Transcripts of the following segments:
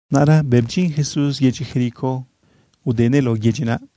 Naꞌra bëꞌ bdyin Jesús yedyi Jericó udenëꞌ lao yedyi naꞌ.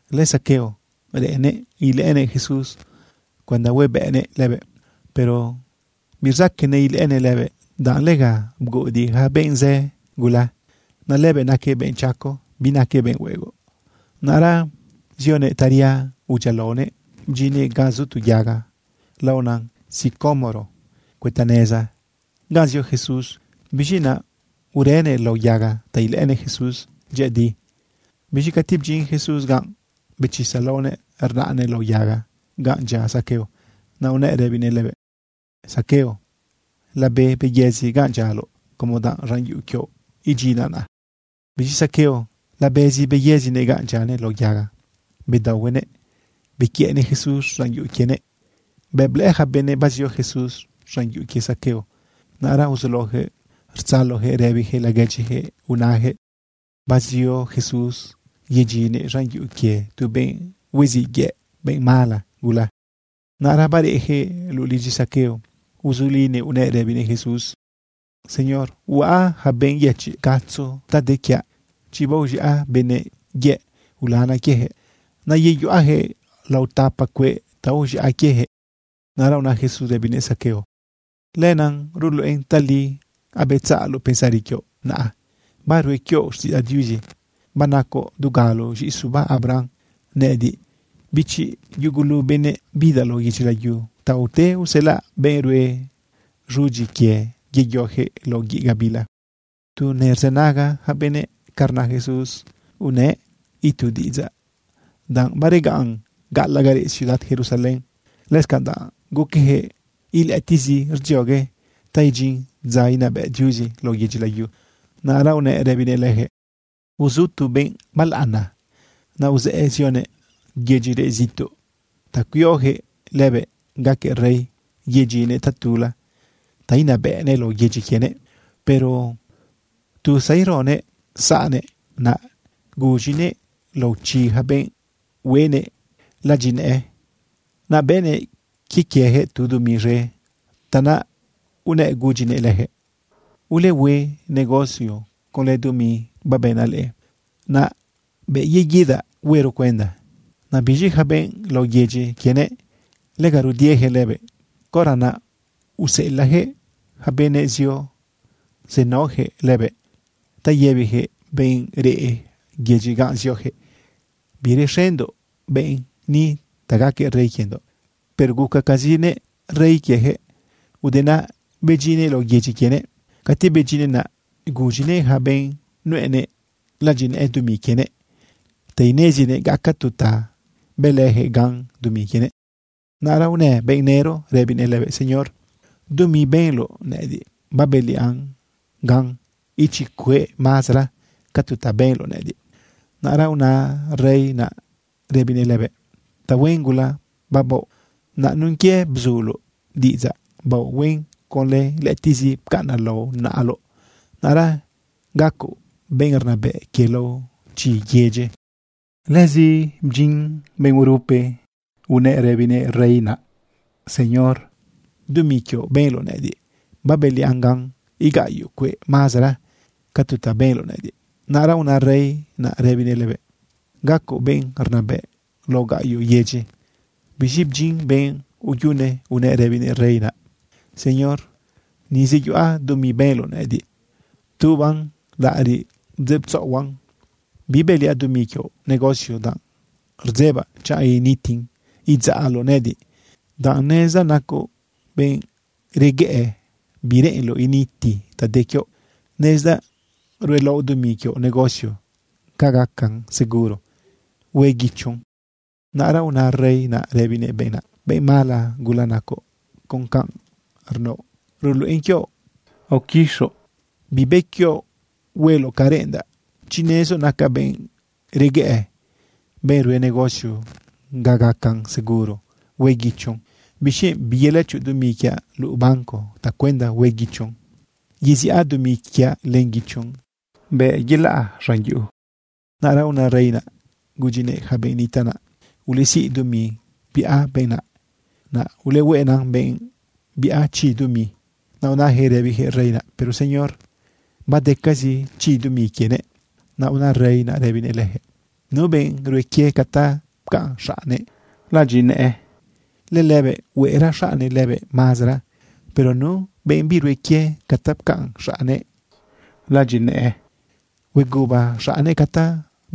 LëZaqueo reꞌennëꞌ ilëꞌënëꞌ Jesús cuenda huebëꞌnëꞌ lëbëꞌ. Pero birzaqueꞌnëꞌ ilëꞌënëꞌ lëbëꞌ, danꞌ lega bguꞌudiꞌ yaca benꞌ zë gula. Naꞌ lëbëꞌ naquëꞌ benꞌ chaco, binaquëꞌ benꞌ huegoꞌ. Naꞌra zionëꞌ taria udyialaonëꞌ bdyinnëꞌ ganꞌ zu tu yaga laona sicómoro cuëta neza ganꞌ zio Jesús. Biz̃i naꞌ urënëꞌ lao yaga ta ilëꞌënëꞌ Jesús dyëꞌëdi. Biz̃i cati bdyin Jesús ganꞌ, bechisa laonëꞌ rnaꞌnëꞌ lao yaga ganꞌ dyia Zaqueo. Naꞌ unëꞌ rëbinëꞌ lëbëꞌ: ―Zaqueo, labe beyëzi ganꞌ dyialoꞌ como danꞌ z̃an yuꞌu quioꞌ idyinaꞌ naꞌ. Biz̃i Zaqueo labezi beyëzinëꞌ ganꞌ dyianëꞌ lao yaga. Bedaohuenëꞌ bequiëꞌnëꞌ Jesús z̃an yuꞌu quienëꞌ. Bëꞌ blëꞌë yaca benëꞌ bazio Jesús z̃an yuꞌu quie Zaqueo, naꞌra uzulaoyaquëꞌ rtzaloyaquëꞌ rëbiyaquëꞌ laguedyiyaquëꞌ unayaquëꞌ bazio Jesús yedyinnëꞌ z̃an yuꞌu quie tu benꞌ hueziꞌ yëꞌ, benꞌ mala gula. Naꞌra bareꞌyaquëꞌ luꞌu lidyi Zaqueo, uzulinëꞌ unëꞌ rëbinëꞌ Jesús: ―Señor, huaꞌ yaca benꞌ yëchiꞌ gatzo ta de quiaꞌ. Chi baoz̃iaꞌ benëꞌ yëꞌ ulanaꞌ quieyaquëꞌ, naꞌ yeyuꞌayaquëꞌ lao tapa cueꞌ ta aoz̃iaꞌ quieyaquëꞌ. Naꞌra una Jesús rëbinëꞌ Zaqueo: ―Lenaꞌ ruluꞌen tali abetzaꞌloꞌ pensari quioꞌ, naꞌ barue quioꞌ xtiꞌidzaꞌ Diuzi. Banacoꞌ dugalo z̃iꞌi suba Abraham. Nëꞌëdiꞌ, bichi yugulu benëꞌ, bidaꞌ lao yedyi layu ta ute uselaꞌ benꞌ ruen z̃udyi quie yeyoyaquëꞌ lao guiꞌ gabila. Tu nerzënaga yaca benëꞌ ca rna Jesús, unëꞌ itu diꞌidzaꞌ danꞌ baregaꞌn gaꞌalaꞌ ga reꞌ ciudad Jerusalén, lëscanꞌ danꞌ guqueyaquëꞌ ilëꞌëtiꞌzi rdziogue ta idyin dza inabëꞌ Diuzi lao yedyi layu. Naꞌra unëꞌ rëbinëꞌ leyaquëꞌ: ―Uzu tu benꞌ balaꞌana. Naꞌ uzëꞌë zionëꞌ yedyi reꞌ zituꞌ ta cuioyaquëꞌ lëbëꞌ gaquëꞌ rey yedyinnëꞌ tatula ta inabëꞌnëꞌ lao yedyi quienëꞌ. Pero tu zaironëꞌ saꞌnëꞌ, naꞌ guz̃inëꞌ lao chi yaca benꞌ hueꞌnëꞌ ladyinëꞌë. Naꞌ bëꞌnëꞌ quie quieyaquëꞌ tu dumi z̃e. Tanaꞌ unëꞌ gudyinëꞌ leyaquëꞌ: “Ulehue negocio conlë dumi babënaꞌ leꞌe. Naꞌ bëꞌ yeguidaꞌ huero cuenda.” Naꞌ biz̃i yaca benꞌ lao yedyi quienëꞌ, lega rudieyaquëꞌ lëbëꞌ. Caora naꞌ useꞌelaꞌyaquëꞌ yaca benëꞌ zio zenaoyaquëꞌ lëbëꞌ ta yëbiyaquëꞌ benꞌ reꞌ yedyi ganꞌ zioyaquëꞌ: “Birexendoꞌ benꞌ ni ta gaquëꞌ rey quiendoꞌ.” Pero gucacazinëꞌ rey quieyaquëꞌ. Ude naꞌ bedyinnëꞌ lao yedyi quienëꞌ. Cati bedyinnëꞌ, naꞌ guz̃inëꞌ yaca benꞌ nuꞌenëꞌ ladyinëꞌë dumi quienëꞌ ta inezinëꞌ gaca tu ta bëlëyaquëꞌ gan dumi quienëꞌ. Naꞌra unë benꞌ nëro rëbinëꞌ lëbëꞌ: “Señor, dumi benloꞌ nëꞌëdiꞌ, babëliaꞌn gan ichi cueꞌ mazara ca tu ta benloꞌ nëꞌëdiꞌ.” Naꞌra una rey naꞌ rëbinëꞌ lëbëꞌ: “Tahuen gula babaoꞌ. Naꞌ nun quie bzuloꞌ diꞌidzaꞌ baoꞌ huen conlë lëꞌëtiꞌzi pcaꞌnaꞌ lao naꞌaloꞌ, naꞌra gacoꞌ benꞌ rnabëꞌ quie lao chi yedyi.” Lëzi bdyin benꞌ urupe unëꞌ rëbinëꞌ rey naꞌ: “Señor, dumi quioꞌ benloꞌ nëꞌëdiꞌ, babëliaꞌn gan igaꞌyo cueꞌ mazara ca tu ta benloꞌ nëꞌëdiꞌ.” Naꞌra una rey naꞌ rëbinëꞌ lëbëꞌ: “Gacoꞌ benꞌ rnabëꞌ lao gaꞌyoꞌ yedyi.” Biz̃i bdyin benꞌ uyune unëꞌ rëbinëꞌ rey naꞌ: “Señor, ni zeyuꞌa dumi benloꞌ nëꞌëdiꞌ. Ptubaꞌn laꞌariꞌ bdzeꞌtzaꞌohuaꞌn. Bibëliaꞌ dumi quioꞌ negocio, danꞌ rdzebaꞌ chanꞌ initin idzaꞌloꞌ nëꞌëdiꞌ, danꞌ nezdaꞌ nacoꞌ benꞌ reguëꞌë bireꞌenloꞌ initi ta de quioꞌ. Nezdaꞌ ruelaoꞌ dumi quioꞌ negocio ga gacan seguro hue guichon.” Naꞌra una rey naꞌ rëbinëꞌ benꞌ naꞌ: “Benꞌ mala gula nacoꞌ. Con canꞌ rnaoꞌ ruluꞌen quioꞌ aoquixoꞌ bibë quioꞌ hueloꞌ ca reꞌendaꞌ. Chi nezoꞌ nacaꞌ benꞌ reguëꞌë, benꞌ rue negocio ga gacan seguro hue guichon, ¿bixquienꞌ biyelëchoꞌ dumi quiaꞌ lao banco tacuenda hue guichon yeziꞌa dumi quiaꞌ len guichon bëꞌ yelaꞌ z̃an yuꞌu?” Naꞌra una rey naꞌ gudyinëꞌ yaca benꞌ nitaꞌ naꞌ: “Ulesiꞌ dumi biꞌa benꞌ naꞌ, naꞌ ulehueꞌna benꞌ biꞌa chi dumi.” Naꞌ unayaquëꞌ rëbiyaquëꞌ rey naꞌ: “Pero Señor, badecazi chi dumi quienëꞌ.” Naꞌ una rey naꞌ rëbinëꞌ leyaquëꞌ: “Nu benꞌ rue quie ca ta pcaꞌn xaꞌnnëꞌ ladyinëꞌë, lëlëbëꞌ hueꞌra xaꞌnnëꞌ lëbëꞌ mazara. Pero nu benꞌ birue quie ca ta pcaꞌn xaꞌnnëꞌ ladyinëꞌë, hueguba xaꞌnnëꞌ ca ta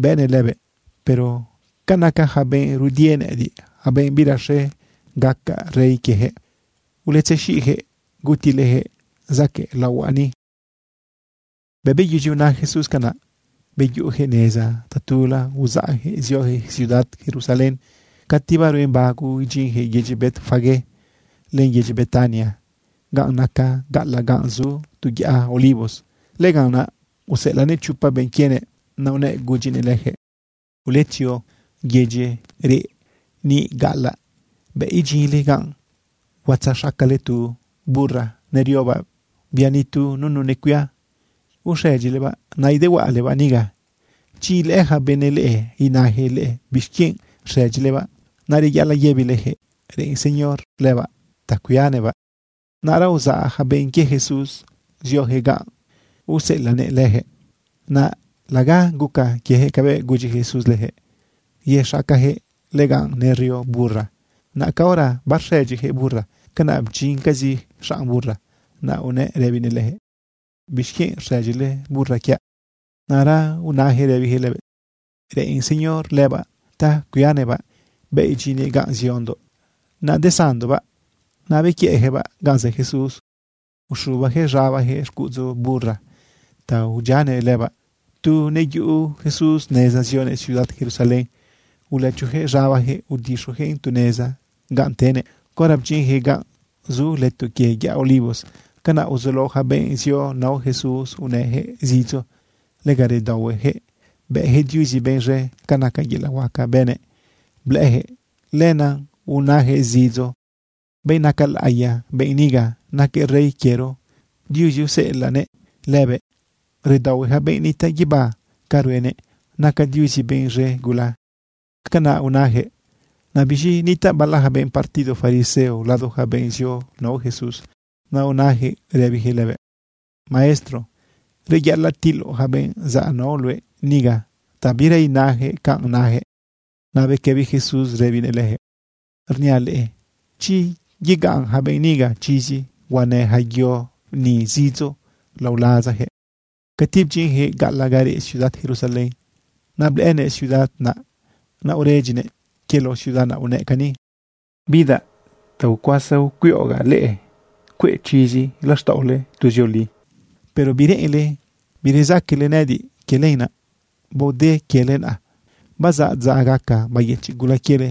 bëꞌnëꞌ lëbëꞌ. Pero ca naca yaca benꞌ rudie nëꞌëdiꞌ, yaca benꞌ birexe gacaꞌ rey quieyaquëꞌ, uletzexiꞌyaquëꞌ gutileyaquëꞌ zaquëꞌ laohuaꞌ ni.” Bëꞌ beyudyi una Jesús canaꞌ, beyuꞌuyaquëꞌ neza tatula uzaꞌyaquëꞌ zioyaquëꞌ ciudad Jerusalén. Cati baruen bago idyinyaquëꞌ yedyi Betfagé len yedyi Betania, ga nacan gaꞌalaꞌ ganꞌ zu tu yaꞌa Olivos, lëganꞌ naꞌ useꞌelaꞌnëꞌ chopa benꞌ quienëꞌ. Naꞌ unëꞌ gudyinëꞌ leyaquëꞌ: ―Uletzio yedyi reꞌ niꞌ gaꞌalaꞌ. Bëꞌ idyinle ganꞌ, huatzaxacale tu burra neriobaꞌ, bia nitu nunu necuia. Uxëdyilebaꞌ nadahuaꞌalebaꞌ niga. Chi ilëꞌë yaca benëꞌ leꞌe inayaquëꞌ leꞌe bixquienꞌ rxëdyilebaꞌ, naꞌ reyaꞌalaꞌ yëbileyaquëꞌ reꞌen Señor lëbaꞌ ta cuianëꞌbaꞌ. Naꞌra uzaꞌ yaca benꞌ quie Jesús zioyaquëꞌ ganꞌ useꞌelaꞌnëꞌ leyaquëꞌ. Naꞌ laga guca quieyaquëꞌ cabëꞌ gudyi Jesús leyaquëꞌ yexacayaquëꞌ lëganꞌ nerio burra. Naꞌ caora barxëdyiyaquëꞌ burra, canaꞌ bdyincazi xanꞌ burra, naꞌ unëꞌ rëbinëꞌ leyaquëꞌ: ―¿Bixquienꞌ rxëdyile burra quiaꞌ? Naꞌra unayaquëꞌ rëbiyaquëꞌ lëbëꞌ: ―Reꞌen Señor lëbaꞌ ta cuianëꞌbaꞌ. Bëꞌ idyinnëꞌ ganꞌ ziondoꞌ, nadesanndoꞌbaꞌ. Naꞌ bequiëꞌyaquëꞌbaꞌ ganꞌ zë Jesús, uxubayaquëꞌ z̃abayaquëꞌ xcuꞌudzu burra ta udyianëꞌ lëbaꞌ. Tu neyuꞌu Jesús neza zionëꞌ ciudad Jerusalén, ulëchoyaquëꞌ z̃abayaquëꞌ udixuyaquëꞌn tu neza ganꞌ tenëꞌ. Caora bdyinyaquëꞌ ganꞌ zu leto quie yaꞌa Olivos, canaꞌ uzulao yaca benꞌ zio nao Jesús unëyaquëꞌ zidzo. Lega redaohueyaquëꞌ bëyaquëꞌ Diuzi benꞌ z̃e ca naca yelaꞌ huaca bënëꞌ blëꞌëyaquëꞌ. Lenaꞌ unayaquëꞌ zidzo: ―Benꞌ naca laꞌiya benꞌ niga. Naquëꞌ rey quiero. Diuzi useꞌelaꞌnëꞌ lëbëꞌ. Redaohue yaca benꞌ nitaꞌ guibá ca ruenëꞌ. Naca Diuzi benꞌ z̃e gula. ―Canaꞌ unayaquëꞌ. Naꞌ biz̃i nitaꞌ bala yaca benꞌ partido fariseo lado yaca benꞌ zio nao Jesús. Naꞌ unayaquëꞌ rëbiyaquëꞌ lëbëꞌ: ―Maestro, reyaꞌalaꞌ tiloꞌ yaca benꞌ zaꞌ nao luëꞌ niga ta bira inayaquëꞌ canꞌ nayaquëꞌ. Naꞌ bequëbi Jesús rëbinëꞌ leyaquëꞌ: ―Rniaꞌ leꞌe, chi yegaꞌn yaca benꞌ niga chizi, huanë yaca yo ni zidzo lao lazayaquëꞌ. Cati bdyinyaquëꞌ gaꞌalaꞌ ga reꞌ ciudad Jerusalén, naꞌ blëꞌënëꞌ ciudad naꞌ, naꞌ uredyinëꞌ. Quie lao ciudad naꞌ unëꞌ cani: ―Bidaꞌ ta ucuasa ucuiꞌogaꞌ leꞌe cueꞌ chizi laxtaꞌole tuzioli, pero bireꞌenle birezaquele nëꞌëdiꞌ. Quie lenaꞌ baode quiele naꞌa. Bazaꞌ dza gaca bayëchiꞌ gula quiele.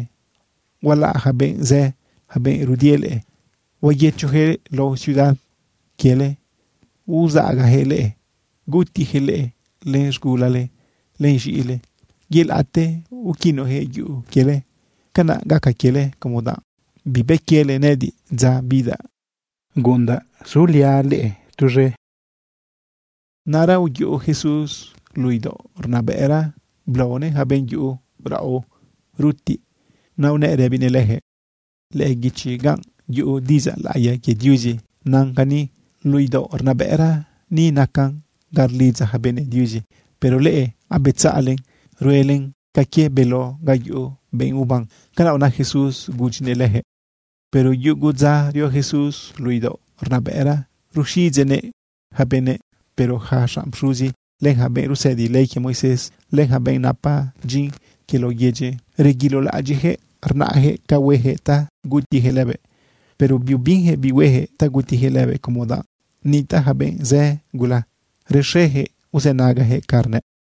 Hualaꞌ yaca benꞌ zë, yaca benꞌ rudie leꞌe. Huayëchoyaquëꞌ lao ciudad quiele uzaꞌagayaquëꞌ leꞌe. Gutiyaquëꞌ leꞌe len z̃gulale len z̃iꞌile. Yelaꞌte uquinuyaquëꞌ yuꞌu quiele. Canaꞌ gaca quiele como danꞌ bibë quiele nëꞌëdiꞌ dza bidaꞌ guꞌundaꞌ suliaꞌ leꞌe tuz̃e. Naꞌra uyuꞌu Jesús luꞌu idaoꞌ rnabëꞌra blaonëꞌ yaca benꞌ yuꞌu raꞌo rutiꞌ. Naꞌ unëꞌ rëbinëꞌ leyaquëꞌ: ―Lëꞌë guichi ganꞌ yuꞌu diꞌidzaꞌ laꞌiya quie Diuzi nan cani: “Luꞌu idaoꞌ rnabëꞌra ni nacan ga rlidza yaca benëꞌ Diuzi.” Pero leꞌe abetzaꞌlen ruelen ca quie beló ga yuꞌu benꞌ uban. ―Canaꞌ una Jesús gudyinëꞌ leyaquëꞌ. Pero yugu dza rio Jesús luꞌu idaoꞌ rnabëꞌra ruxiꞌidzeꞌnëꞌ yaca benëꞌ. Pero yaca xanꞌ pxuzi, len yaca benꞌ rusëdi ley quie Moisés, len yaca benꞌ napa dyin quie lao yedyi, reguilolaꞌadyiꞌyaquëꞌ rnaꞌyaquëꞌ ca hueyaquëꞌ ta gutiyaquëꞌ lëbëꞌ. Pero biubinyaquëꞌ bi hueyaquëꞌ ta gutiyaquëꞌ lëbëꞌ, como danꞌ nitaꞌ yaca benꞌ zë gula rexeyaquëꞌ uzënagayaquëꞌ canꞌ rnëꞌ.